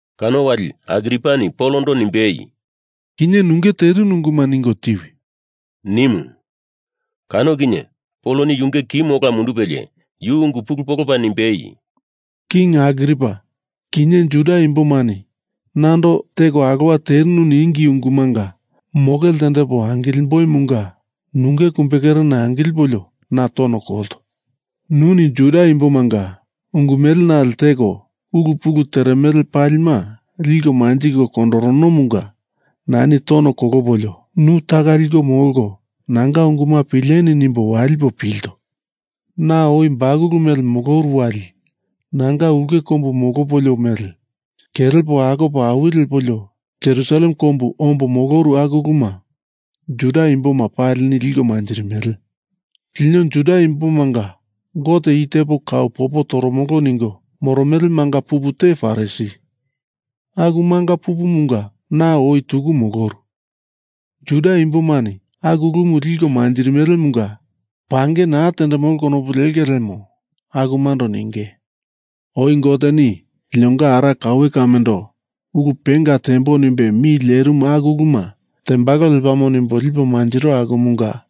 Kano wali Agripani Polondo nimbei, “Kinye nunge terinu unguma ningo tiwi,” nimu. Kano kinye Poloni yunge kimu ola mundupelie yu ungu pulu polopa nimbei, “King Agripa, kinye Juda imbomani nando teko alowa terinu ningi ungumanga moke ltendepo nimboimunga nunge kumbekerena angilipolio, na tono kolto. Nuni Juda imbomanga ungu mele nale teko, ulu pulu teremele palima liko manjiko kondoronomunga nani tono kolopolio nu taka liko molko nanga unguma pileni nimbo walipo pilto. Na oi bakulu moloru wali nanga ulke kombu molopolio mele, kelepo akopo awi lepolio Jerusalem kombu ombo moloru aku uluma Juda imboma palini liko manjirimele. Lino Juda imbomanga Gote i tepo kau popo tamili ningo moromele manga pupu te Farisi, aku manga pupumunga na oi tuku moloru. Juda imbomani aku ulumu liko manjirimelemunga pange naa tendemolo konopu lenge lemo akumando ninge. Oi Goteni linonga ara kaue kamendo ulu penga tembo nimbe mi lerimu aku uluma tembalo lepamo nimbo lipo mantiro akumunga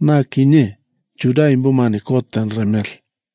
na kinye Juda imbomani kot tenderemele.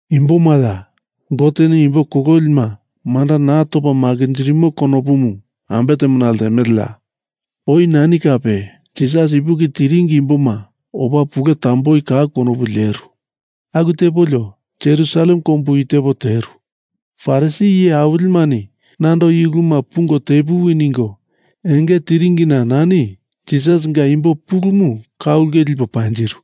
Imbomaya, Goteni imbo kololima manda naa topa makinjirimo konopumu ambe temona ltemeleya? Oi nani kape Jisas ipuki tiringi imboma opa pule tamboi kau konopu leru. Aku tepolio Jerusalem kombu i tepo teru. Farisi iye awilimani nando i uluma pungo tepuwi ningo enge tiringina nani Jisasinga imbo pulumu ka ulke lipo panjiru.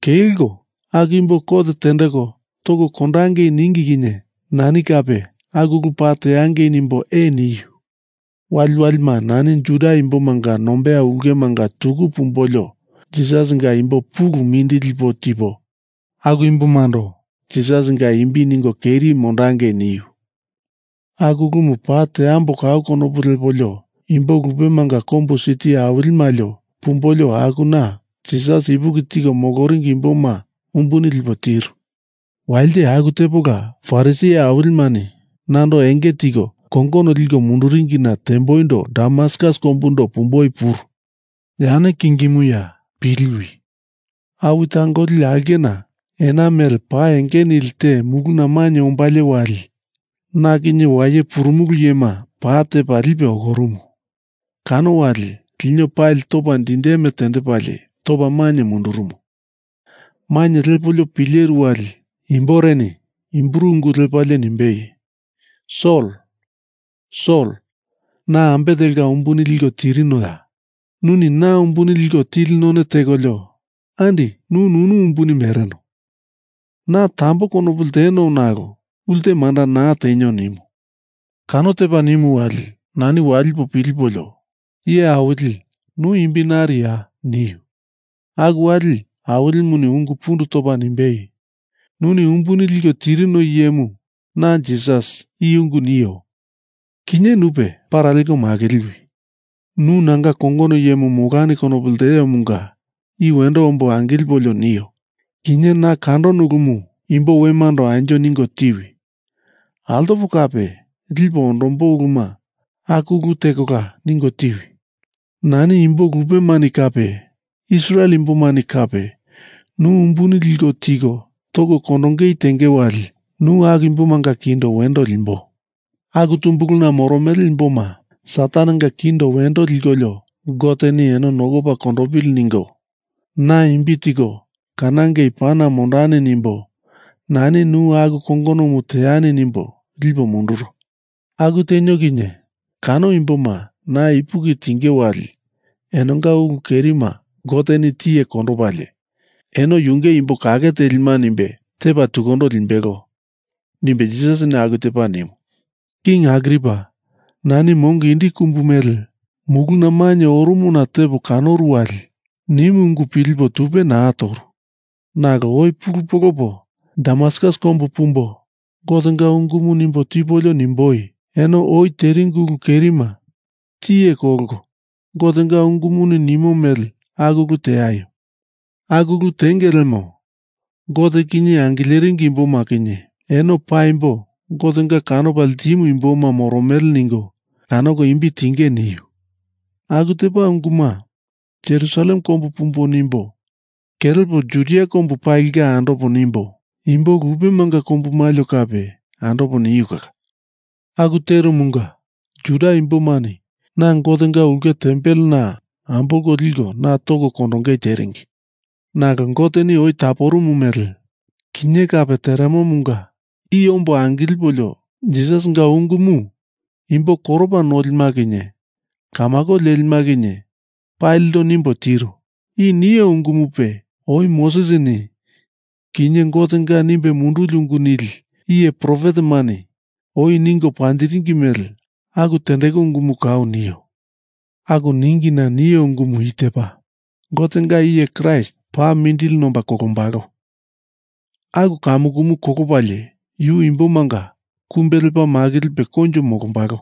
Kelko aku imbo kot tendeko toko kondangei ningi kinye nani kape aku ulu paa teangei nimbo ee niu. Waliwalima nani Juda imbomanga nombeya ulke manga tuku pumbolio Jisasinga imbo pulu mindili lipo tipo aku imbomando Jisasinga imbi ningo keri mondondangei niu. Aku ulumu paa teambo kau konopu lepolio imbo lupemanga kombu siti awili malio pumbolio akuna Jisas ipuki tiko moloringi imboma umbuni lipo tiru. Walite aku tepola Farisi iye awilimani nando enge tiko kongono liko munduringina temboindo Damaskus kombundo pumboi puru. Yane kingimuya piliwi. Awi tangoli aulkena ena mele pa enge nili te muluna mainye ombalie wali na kinye waye purumulu iyema pa tepa lipe okorumu. Kano wali lino palima topa dindeme tendepalie topa maina mainye mundurumu. Mainye lepolio pileru wali imboreni Hibru ungu lepalie nimbei, ‘Sol, Sol na ambe telka umbuni liko tirinoya. Nuni na umbuni liko tili none tekolio andi nu nunu umbuni mereno. Na tambo konopu lteno nalo ulte manda naa tenio,’ nimu. Kano tepo nimu wali nani walipo pilipolio, ‘Iye Awili nu imbi nariya?’ niu. Aku wali Awilimuni ungu pundu topa nimbei, ‘Nuni umbuni liko tirino iyemu na Jisas, i ungu nio. Kinye nupe para leko makiliwi. Nu nanga kongono iyemu molani kanopo ltiomunga i wendo ombo angilipolio nio. Kinye na kandono ulumu imbo wemando anjo ningo tiwi. Altopo kape lipo ondombo uluma aku ulu tekola ningo tiwi. Nani imbo lupemani kape Israel imbomani kape nu umbuni liko tiko toko kondongei tenge wali nu aku imbomanga kindo wendo limbo. Aku tumbuluna moromele imboma Satanenga kindo wendo likolio Goteni eno nokopa kondopili ningo na imbi tiko kanangei pana mondani nimbo nani nu aku kongonomu teani nimbo lipo munduro. Aku tenio kinye kano imboma na ipuki tinge wali enonga ulu kerima Goteni tiye kondopalie, eno yunge imbo kake telima nimbe tepa tukundo limbelo,’ nimbe Jisasini aku tepa nimu. King Agripa, nani mongo indi kumbu mele muluna mainye oromona tepo kanoru wali nimu ungu pilipo tupe naa toru. Nalo oi pulu polopo Damaskus kombu pumbo Gotenga ungumu nimbo tipolio nimboi, ‘Eno oi teringi ulu kerima tiye kolko Gotenga ungumuni nimo mele aku ulu teaio. Aku ulu tenge lemo Gote kinye angileringi imboma kinye eno paimbo Gotenga kanopa ltimu imboma moromele ningo kanoko imbi tinge,’ niu. Aku tepa unguma Jerusalem kombu pumbo nimbo kelepo Judia komba palinga andopo nimbo imbo lupemanga kombu malio kape andopo niu kala. Aku terumunga Juda imbomani na Gotenga ulke tempelena ambolko liko na toko kondongei teringi. Nalo Goteni oi taporumu mele, kinye kape teremomunga i ombo angilipolio Jisasinga ungumu imbo koropa nolima kinye kamako lelima kinye palindo nimbo tiro. I nio ungumupe oi Mosesini kinye Gotenga nimbe munduli ungu nili iye profetemani oi ningo panjiringi mele aku tendeku ungumu kau nio. Aku ningina nio ungumu i tepa, Gotenga iye Kraist paa mindili nomba kolombalo. Aku kamukumu kolopalie, yu imbomanga kumbe lepa makilipe koinjo molombalo.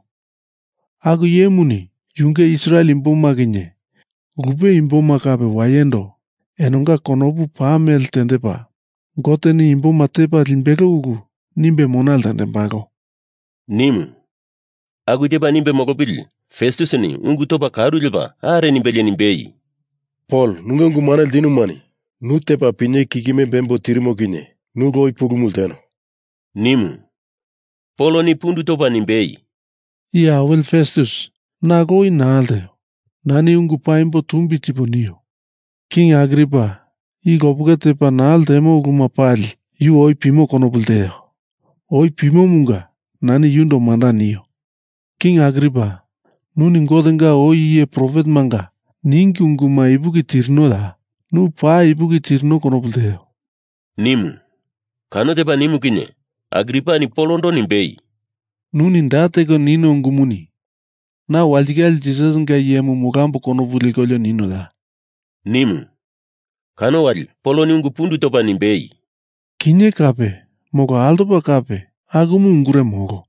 Aku iyemuni yunge Israel imboma kinye lupe imboma kape wayendo enonga konopu pa mele tendepa Goteni imboma tepa limbelo ulu nimbe mona ltendembalo,” nimu. Aku tepa nimbe molopili Festusini ungu topa karu lepa are nimbelie nimbei, “Pol, nunge ungu mane ltinumani nu tepa pinyewe kikime bembo tirimo kinye nu lowi pulumu lteno,” nimu. Poloni pundu topa nimbei, “Iye awili Festus, na lowi naa lteo. Nani ungu paimbo tumbi tipo nio. King Agripa i lopeke tepa naa ltemo uluma pali yu oi pimo konopu lteo. Oi pimomunga nani yundo manda nio. King Agripa, nuni Gotenga oi iye profetemanga ningi unguma ipuki tirinoya? Nu paa ipuki tirino konopu lteo,” nimu. Kano tepa nimu kinye Agripani Polondo nimbei, “Nuni da teko nino ungumuni na walitikale Jisasinga iyemu molambo konopu lekolio ninoya?” nimu. Kano wali Poloni ungu pundu topa nimbei, “Kinye kape molo altoko kape akumu ungure molo.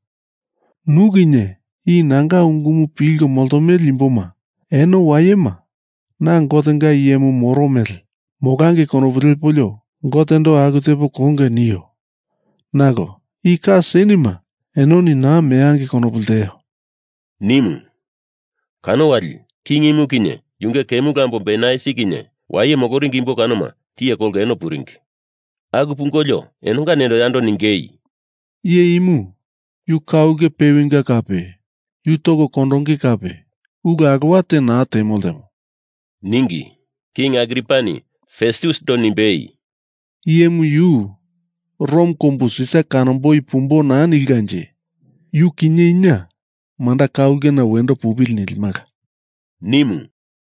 Nu kinye i nanga ungumu pilko moltomele imboma eno wayema na Gotenga iyemu moro mele molangei konopu lepolio Gotendo aku tepo konge nio. Nalo i ka senema enoni naa meangei konopu lteo,” nimu. Kano wali King imu kinye yunge kemulu ambomu Bernaisi kinye waye moloringi imbo kanoma tiye kolko eno puringi. Aku pungolio enonga nendo yando ningei, “Iye imu yu ka ulke pewinga kape yu toko kondonge kape ulu alowa te naa temo ltemo,” ningi. King Agripani Festusindo nimbei, “Iye imu yu Rom kombu Sisar kanomboi pumboi naa nilkanje yu kinye ina manda ka ulkena wendo pupili nilimala,” nimu.